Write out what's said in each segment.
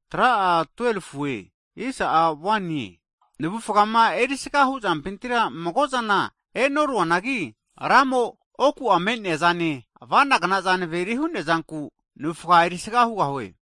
Hagi navufgama erisaga hu'zampintira mago'zana e'noruanagi, Ramo'a oku'a me'nea zane avanagnaza naveri hu'nea zanku navufga erisagahu kea hugahue.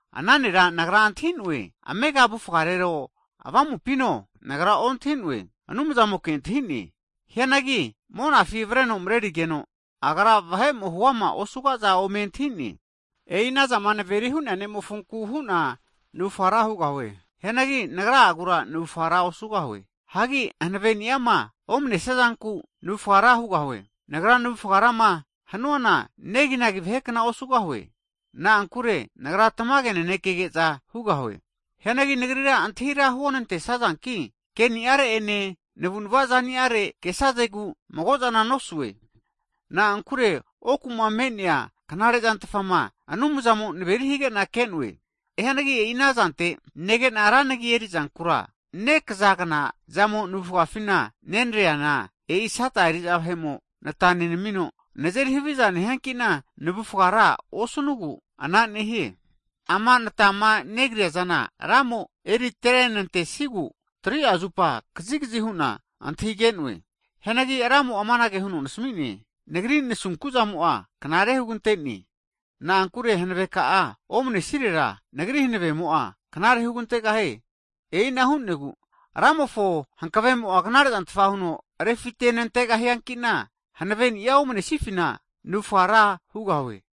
Ana nera nagra ontahi'noe, amega avufgarero avamupino, nagra ontahi'noe, Anumzamoke antahine. Hianagi Monafi (Paradise) avreno marerigeno, hunagru higeno vahe'mo'a huama osuga'za ome antahi'ne. E'i anazama naveri hu'nea ne'mofonku hu'na navufga ra hugahue. Hianagi nagra'agura navufga ra osugahue. Hagi hanaveniama omanenesia zanku navufga ra hugahue. Nagra navufga rama hanuana neginagi vahekna osugahue. Na'ankure nagra tamage nanekege'za hugahue. Hianagi nagrira antahi ra huonantesazanki keniare'ene navunava zaniare kesazegu mago'zana nosue. Na'ankure oku'ma me'nea knare'zantafa Anumzamo naveri hige'na ke'noe. Hianagi e'ina zante nege'na ra nagi erizankura, nekazagna zamo navufgafi nenreana, e'i Sata eri'za vahe'mo nata nenamino, nazeri haviza nehianki'na navufga ra osnugu anara nehie. Ama ana natama negriazana Ramo eritrenantesiegu, 3'a zupa kazigazi hu'na antahige'noe. Hianagi Ramo'a amanage huno nasmine, Nagri nasunkuzamo'a knare kagrira hugantene. Na'ankure hanave ka'a omanesirera, Nagri hanavemo'a knare hugantegahie. E'ina hu'negu, Ramofo hankavemo'a knarezantfa huno refite nantegahiankina hanaveni'a omanesifina muse nehu'na navufga ra hugahue.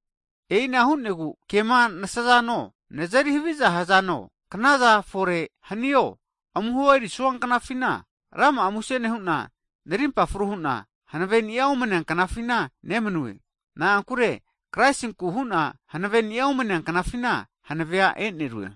E'ina hu'negu kema nasazano, nazeri haviza hanazo, knaza fore hanio, amuho erisua knafina rama'a muse nehu'na, narimpa fru hu'na hankave'nia omnea knafina nemanue. Na'ankure Kraisinku hu'na hanaveni'a omanea knafina, hankave'nia e'nerue.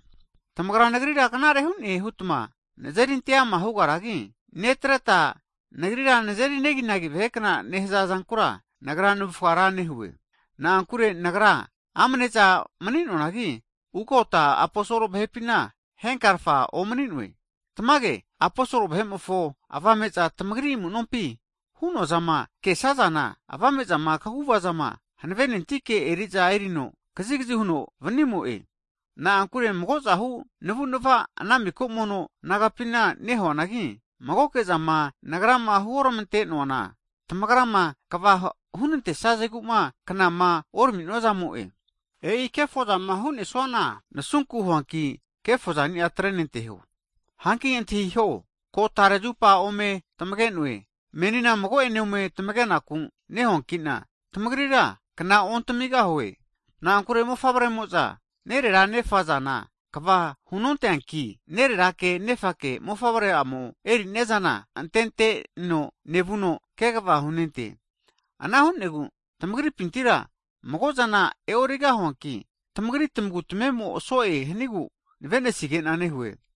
Tamagra nagrira knare hu'ne hutma nazeri ante'ama hugaragi, netreta nagrira nazeri neginagi vahekna nehaza zankura, nagra navufga ra nehue. Na'ankure nagra amneza mani'noanagi, ugota aposol vahepina henkarfana omani'noe. Tamage aposol vahe'mofo avame'za tamagri amunompina hu'noa zama kesazana, avame'zama, kagu'vazama hanavenentike eri'zana eri'na kazigazi hu'na vu'noe. Na'ankure mago'zahu navunava ana miko mono nagapina nehuanagi, magoke'zama nagrama huoramante'noana tamagrama kva hunantesazeguma knama orami'nozamo'e. E'i kefozama hu'nesuana nasunku huanki kefozania atrenanteho. Hanki antahiho, ko tare zupa ome tamage'noe, meni mago'ene ome tamageku nehuankina tamagrira kna ontamigahue. Na'ankure mofavremo'za nerera nefazana kva hunonteanki, Nererake nefake mofavre'amo eriniazana antenteno nevuno kegava hunente. Ana hunegu tamagripintira mago'zana e'origahuanki, tamagri tamagu tamemo so'e hanigu nave'nesige'na nehue.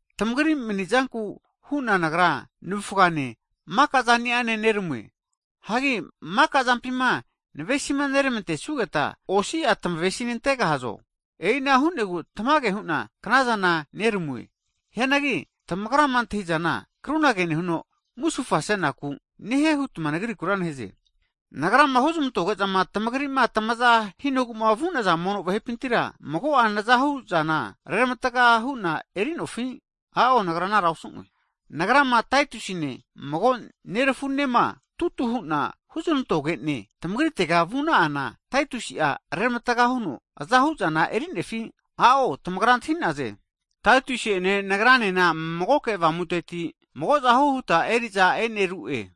Tamagri manizanku hu'na nagra navufgane, maka'zaniane neramue. Hagi rama'azampima navesineramantesugeta, tamagra osi'a tamavesinantegahazo? E'inahukna hu'negu tamage hu'na knazana noramue. Hianagi tamagrama antahi'zana krunage nehuno musufasenaku nehie hutma nagrikura neheze. Nagrama huzmantoge'zama tamagri'ma tamaza hanugu'ma vu'naza mono vahepintira, mago'a nazahuzana reramatga hu'na enerufi? A'o nagra anara nosue. Nagrama, Taitusine mago nerafunema tutu hu'na huznantogene tamagritega vuna'ana Taitusi'a reramatga huno mago'a azahu zana erinefi? I'o tamagra antahi'naze, Taitusi'ene nagranena magoke avamuteti magozahu huta erizana e'neru'e.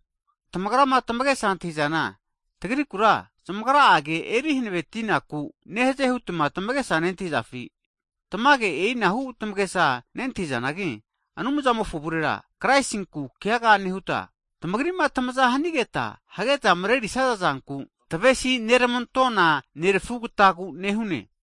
Tamagrama tamagesa antahizana, tagrikura zamagra'a ke erihanavetinaku nehaze hutma tamagesa nentahizafi? Tamage e'inahu tamagesa nentahizanagi, Anumzamofo avurera Kraisinku keaga nehuta tamagrima tamaza hanigeta hageta mrerisaza zanku tamavesi neramantona nerafugatagu nehune.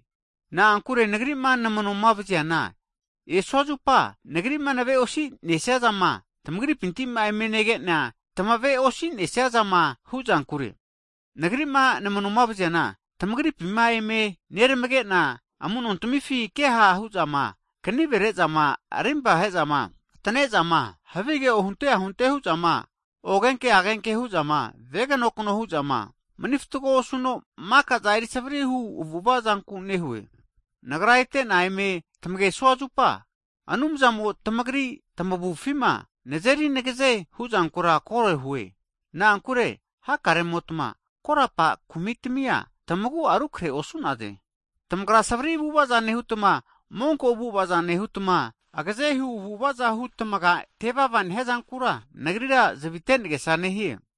Na'ankure nagri'ma namanoma vaziana, esua zupa nagri'ma naveosi nesiazama tamagripima eme nege'na tamave'osinesia zama huzankure. Nagri'ma namanoma vaziana, tamagripima eme neramege'na, amu'nontamifi ke ha' hu'zama, kanive rezama, arimpa he'zama, atane'zama, havige ohunte ahunte hu'zama, ogenke agenke hu'zama, veganokno hu'zama, mani fatgo osuno makaza erisavri hu avu'avazanku nehue. Nagra ete'na ome tamagesua zupa, Anumzamo'a tamagri tamavufima nazeri nagaze huzankura kore hue. Na'ankure hakaremotma korapa kumitami'a tamagu'a rukrehe osu'naze. Tamagra savri avu'avaza nehutma, monko avu'avaza nehutma, agazehu avu'avaza hu tamaga tevava nehiazankura nagrira zavite nagesa nehie.